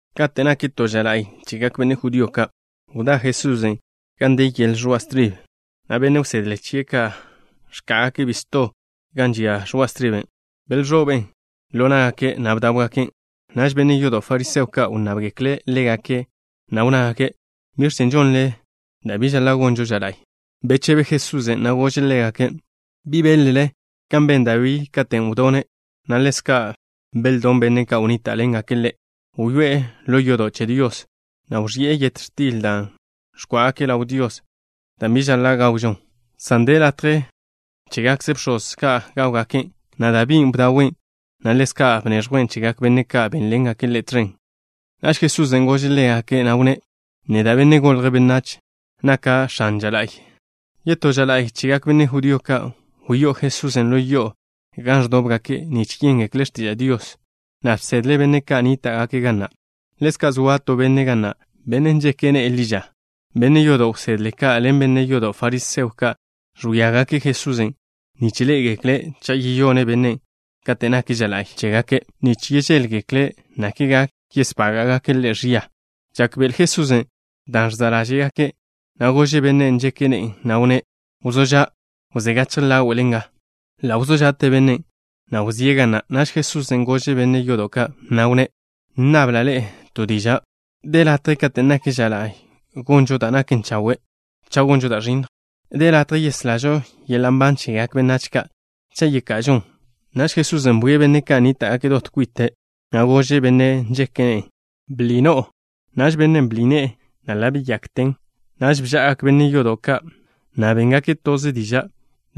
Kate' nak to ža la'y chegak benne' judío ka', wdá Jesusen' gan de yel ẕoa' stribe, na' benne' wsedle chie' ka' ẕká'agake' bisto gan žia ẕoa' striben'. Belẕoben' ḻo ná'gake', na' bdáwgaken'. Naž benne' yodo' fariseo ka' wnnábgekle' ḻégake', na' wnnágake': —¿Biẕ chen' žonle da' bi žaḻa' gonžo ža la'y? Bechebe Jesusen', na' gože' ḻégake': —¿Bi beḻ-le kan ben Dabí katen' wdone', na' ḻezka' beldón benne' ka' wnníta'ḻengake' ḻe'? Wyoé'e ḻo yodo' che Dios, na' wẕi'e yet x̱til dan' ẕgó'ogake' ḻaw Dios, dan' bi žaḻa' gawžon, san de latje chégakze bx̱oz ka' gáwgaken', na' Dabín' bdawen', na' ḻezka' bneẕjwen' chegak benne' ka' bénḻengake' ḻe' tẕen. Naž Jesusen' gože' ḻégake', na' wnné': —Neda', Benne' Golje' Benách, naka' X̱ane ža la'y. Yetó ža la'y chegak benne' judío ka', wyó'o Jesusen' ḻo yo'o gan ẕdóbgake' nich yéngekle' x̱tiža' Dios, na' bsedle' benne' ka' nníta'gake' ga na'. Ḻezka' zoa to benne' ga na', benne' nžeke' ne'e ḻi ža. Benne' yodo' wsedle ka' ḻen benne' yodo' fariseo ka' ẕwíagake' Jesusen', nich ḻé'egekle' cha' yeyone' bennen' kate' nak ža la'y chégake', nich žéḻgekle' nakle gak yesbága'gake' Ḻe' ẕia. Žákbe'ele Jesusen' dan' ẕza' ḻáže'gake', na' gože' bennen' nžeke' ne'e, na' wnné': —Wzó ža'. Wzé gachje ḻáwe'le nga. Ḻa' wzó ža'te bennen', na' wzíe' ga na'. Naž Jesusen' gože' benne' yodo' ka', na' wnné': —Nnabla' ḻe'e to diža'. ¿De latje kate' nak ža la'y gonžo da' naken chawe', cha' gonžo da' ẕinnj? ¿De latje yeslažo yeḻa' nban chegak benách ka', cha' yeka'ažon? Naž Jesusen' bwie' benne' ka' nníta'gake' dot kwite', na' gože' bennen' nžeke' ne'e: —Bḻi no'o. Naž bennen' bḻi ne'e, na' ḻa' beyakten. Naž bža'agak benne' yodo' ka', na' béngake' toze diža'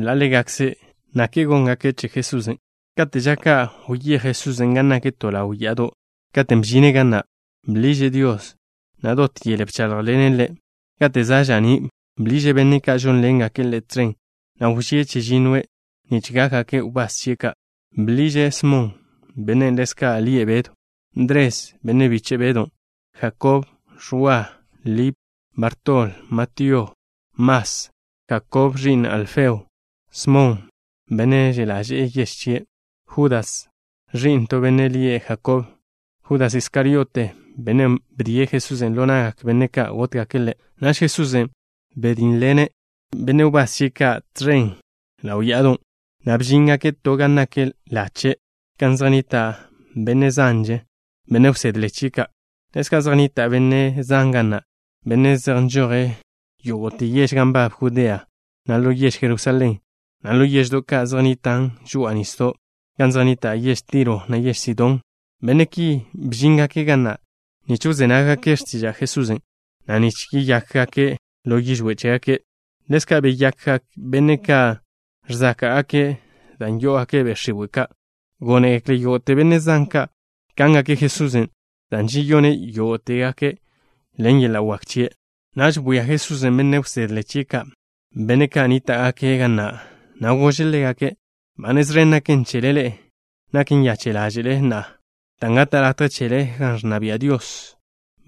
ḻa' ḻégakze' nich žéḻgekle' bi da' góngake' che Jesusen'. Kate' ža ka' wyéj Jesusen' gan nak to ḻaw ya'ado'. Katen' bžine' ga na', bḻiže' Dios, na' dot yele bcháḻjḻene' Ḻe'. Kate' za' ža'ní', bḻiže' benne' ka' žónḻengake' Ḻe' tẕen, na' wžíe' chežinnoe' nich gákgake' wbás chie' ka'. Bḻiže': Smon, (bennen' ḻezka' lie' Bedw), Ndres, (benne' biche' Bedon'), Jakob, Ẕwa, Lip, Bartol, Matío, Mas, Jakob, (ẕi'n Alfeo), Smon, (benne' že' ḻaže'e yež chie'), Judas, (ẕi'n to benne' lie' Jakob), Judas Iskariote, (benne' wdíe' Jesusen' ḻo na'gak benne' ka' gótgake' Ḻe'). Naž Jesusen' bdínneḻene' benne' wbás chie' ka' tẕen ḻaw ya'adon', na' bžíngake' to gan nak lache', gan zej nnita' benne' zanže, benne' wsedle chie' ka'. Ḻezka' zej nnita' benne' zan ga na', benne' zej nžoje' yógo'te yež gan nbab Judea, na' ḻo yež Jerusalén, na' ḻo yeždo' ka' zej nnitan' žoa'a nisdo' gan zej nnita' yež Tiro, na' yež Sidón. Benne' ki bžíngake' ga na' nich wzé nággake' x̱tiža' Jesusen', na' nich yeyákgake' ḻo yižwé' che chégake'. Ḻezka' beyakgak benne' ka' ẕzáka'gake' dan' yó'ogake' be' x̱iwe' ka'. Gónegekle yógo'te benne' zan ka' kángake' Jesusen' dan' žeyone' yógo'tegake' ḻen yeḻa' wak chie'. Naž bwia Jesusen' benne' wsedle chie' ka', benne' ka' nníta'gake' ga na', na' gože' ḻégake': —Ba nez ẕen naken chele ḻe'e, nak nyache' ḻáže'le na'a, dan' gata' latje chele gan ẕnna bia' Dios.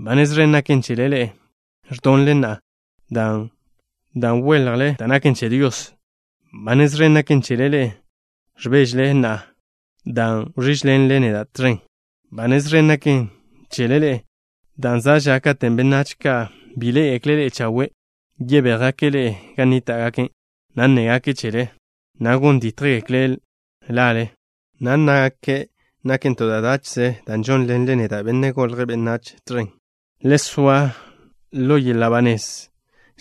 ’Ba nez ẕen naken chele ḻe'e ẕdonle na'a, dan' weljle da' naken che Dios. ’Ba nez ẕen naken chele ḻe'e ẕbéžele na'a, dan' wẕížḻenle neda' tẕen. ’Ba nez ẕen naken chele ḻe'e, dan' za' ža katen' benách ka' bi ḻé'egekle' ḻe'e chawe', yebéjgake' ḻe'e gan nníta'gake', na' nnégake' chele, na' gon dítjgekle' lale, na' nnágake' naken to da' dáche'ze dan' žónḻenle neda', Benne' Golje' Benách, tẕen. Le soa ḻo yeḻa' ba nez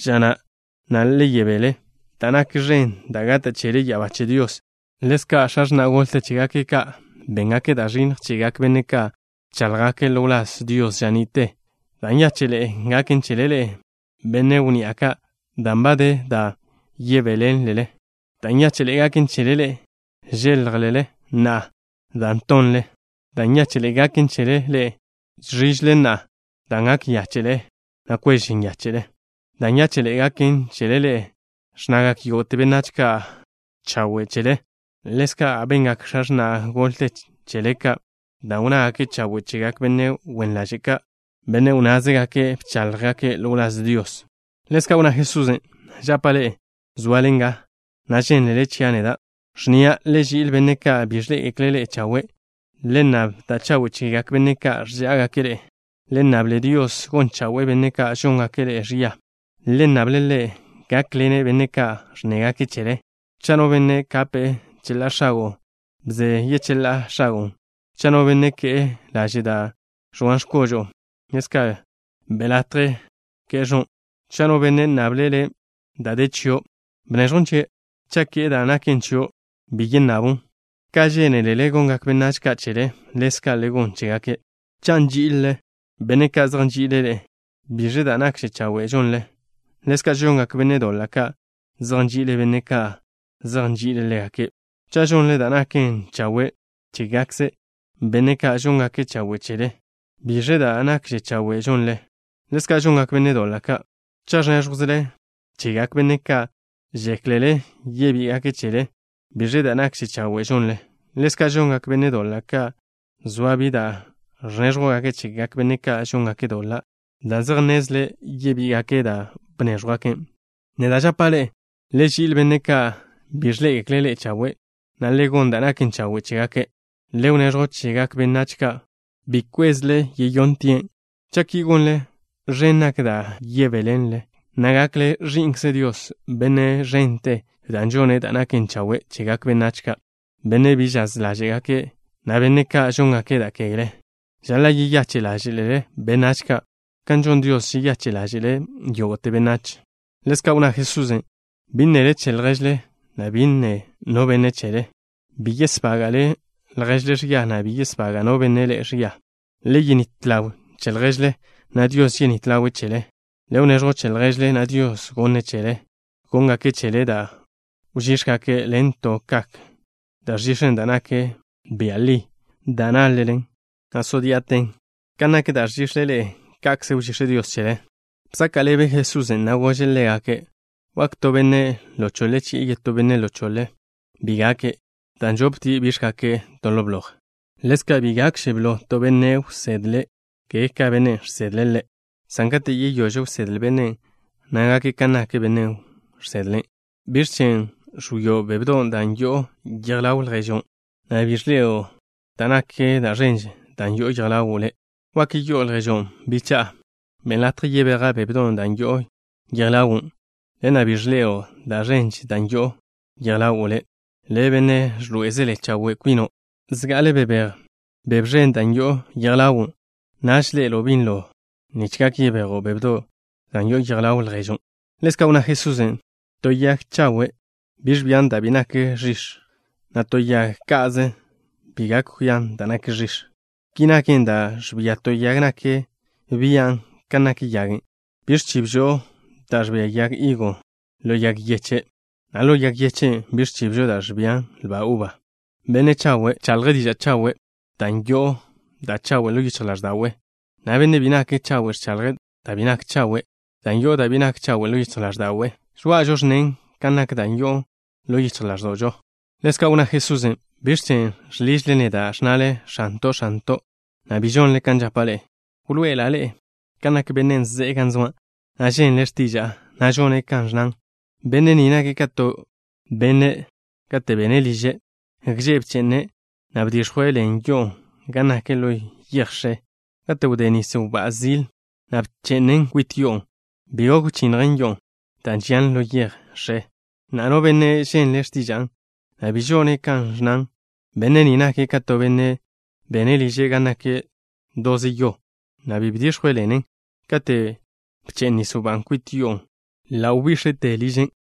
ža na', na' le yebél, dan' nak ẕen da' gata' chele ya'abá che Dios. Ḻezka' x̱a x̱na' golte chégake' ka' béngake' da' ẕinnj chegak benne' ka' bcháḻjgake' ḻo wláz Dios ža ni'te. ’Da' nyáche'ḻe'e gaken chele ḻe'e, benne' wnni'a ka', dan' ba de da' yebéḻenlele. ’Da' nyáche'ḻe'e gaken chele ḻe'e, žéljelele na'a, dan' tonle. ’Da' nyáche'ḻe'e gaken chele ḻe'e, žẕížele na'a, dan' gak nyache' ḻáže'le, na' kwež nyáche'le. ’Da' nyáche'ḻe'e gaken chele ḻe'e, ẕnnagak yógo'te benách ka' chawe' chele. Ḻezka' bengak x̱a x̱na' golte chele ka', dan' wnnágake' chawe' chegak benne' wen ḻaže' ka', benne' wnnázegake' bcháḻjgake' ḻo wláz Dios. Ḻezka' wnná Jesusen': —Žapa' ḻe'e, zoale nga, na' žénlele chia' neda', ẕnnia': Le ži'il benne' ka' bi ẕḻé'egekle' ḻe'e chawe'. Le nnab da' chawe' chegak benne' ka' ẕžá'agake' ḻe'e. Le nnable Dios gon chawe'e benne' ka' žóngake' ḻe'e ẕia. Le nnable' Ḻe' gákḻene' benne' ka' ẕnnégake' chele. Cha' no benne' kape' cheḻá'a x̱ago', bze yecheḻá'a x̱agon'. Cha' no benne' ke'e laže' da' ẕoan x̱kožo'o, ḻezka' be' latje ke'e ẕon'. Cha' no benne' nnable' le' da' de chio', bneẕjwn chie'. Cha' ke'e da' naken chio', bi yennabon'. Ka žénelele gongak benách ka' chele, ḻezka' le gon chégake'. ’Cha' nží'izelele benne' ka' zej nži'ile' ḻe'e, ¿biẕe da' nakže chawe' žonlen? Ḻezka' žongak benne' doḻa' ka', zej nži'ile' benne' ka' zej nži'ile' ḻégake'. Cha' žonle da' naken chawe' chégakze benne' ka' žóngake' chawe' chele, ¿biẕe da' nakže chawe' žonlen? Ḻezka' žongak benne' doḻa' ka'. Cha' ẕnéẕjwzele chegak benne' ka' žéklele yebí'igake' chele, ¿biẕe da' nakže chawe' žonlen? Ḻezka' žongak benne' doḻa' ka', zoa bi da' ẕnéẕjwgake' chegak benne' ka' žóngake' doḻa', dan' zej nnezle' yebí'igake' dan' bnéẕjwgake'. Neda' žapa' ḻe'e: le ži'il benne' ka' bi ẕḻé'egekle' ḻe'e chawe', na' le gon da' naken chawe' chégake'. Le wneẕjw chegak benách ka' ḻa'kze bi žéklele yebí'igake' chele. Cha' ki gonle, ẕen nak da' yebéḻenlen, na' gakle ẕi'nkze Dios, Benne' ẕente, dan' žone' da' naken chawe' chegak benách ka', benne' bi žaz ḻáže'gake', na' benne' ka' žóngake' da' kegle. Žaḻa' yeyache' ḻáže'lele benách ka', kan žon X̱ale Dios, žeyache' ḻáže'le' yógo'te benách. Ḻezka' wnná Jesusen': Bi nnele che lježle, na' bi nne no benne' chele. Bi yesbága'le lježle ẕia, na' bi yesbaga' no benne' ḻe'e ẕia. Le yenít ḻaw che lježle, na' Dios yenít ḻawe' chele. Le wneẕjw che lježle, na' Dios gonne' chele. Gónngake' chele da' wžíx̱gake' ḻen to kak da' ẕžix̱en, dan' nak bia' li, dan' nyižen, na' nyiten že'lte, na' zo dí'aten. Kan nak da' ẕžix̱le ḻe'e, ka'kze wžíx̱ Dios chele. Bzaka' ḻebe Jesusen', na' gože' ḻégake': —¿Wak to benne' ḻo choḻe chi'e yetó benne' ḻo choḻe? Bi gake', dan' žoptie' bíx̱gake' to ḻo bloj. Ḻezka', bi gakže blo to benne' wsedle, ka benne' žsedle' ḻe', san kate' yeyóž wsedle bennen', na' gake' kan nak bennen' žsedle' ḻe'. ’¿Biẕ chen' ẕwio' bébedon' dan' yo'on yej ḻaw lježo', na' bi ẕḻe'elo' da' ẕen dan' yo'on yej ḻawo' le'? ¿Wak yi'o lježon': “Bicha'a, benn latje yebeja' bébedon' dan' yo'on yej ḻawo'” na' bi ẕḻe'elo' da' ẕen dan' yo'on yej ḻawo' le'? Le', benne' ẕḻoé'ezele chawe' kwino'. Zga'ale bebéj da' ẕen dan' yo'on yej ḻawo' le'. Naž ḻe'elo' binlo nich gak yebejo' bébedon' dan' yo'on yej ḻaw lježon'. Ḻezka' wnná Jesusen': —To yag zaka' bi ẕbian da' bi nak ẕix̱, na' to yag ka'ze bi gak kwian da' nak ẕix̱. Ki naken, da' ẕbia to yag nak bian' kan nak yagen'. Bi ẕchibžo da' ẕbia yag higo ḻo yag yeche', na' ḻo yag yeche' bi ẕchibžo da' ẕbia lba uba. Benne' chawe' ẕchaḻje' diža' chawe' dan' yo'o da' chawe' ḻo yichj ḻáẕda'we', na' benne' bi nake' chawe' ẕchaḻje' da' bi nak chawe' dan' yo'o da' bi nak chawe' ḻo yichj ḻáẕda'we'. Žoa'ažo ẕnnen kan nak da' yo'on ḻo yichj ḻáẕdo'žo. Ḻezka' wnná Jesusen': —¿Biẕ chen' žḻižle neda', ẕnnale: “X̱anto', X̱anto'” na' bi žonle kan žapa' ḻe'e? Wḻoe'ela' ḻe'e kan nak bennen' ze'e gan zoa', na' ženle' x̱tiža'a, na' žone' kan ẕnnan. Benne' ni nake' ka to benne', kate' bene' liže', gže' bche'ne', na' bdix̱jwe' ḻen yo'o gan nak ḻo yej x̱e. Kate' wdé nis wbá'a zil, na' bche'nen kwit yo'on', bi gok wchinnjen yo'on', dan' žian ḻo yej x̱e. Na'a, no benne' ženle' x̱tiža'a, na' bi žone' kan ẕnnan, benne' ni nake' ka to benne' bene' liže' gan nak doze yo, na' bi bdix̱jwe' ḻenen. Kate' bche'n nis wbá'a kwit yo'on', ḻa' wžía yi'ten belate ža.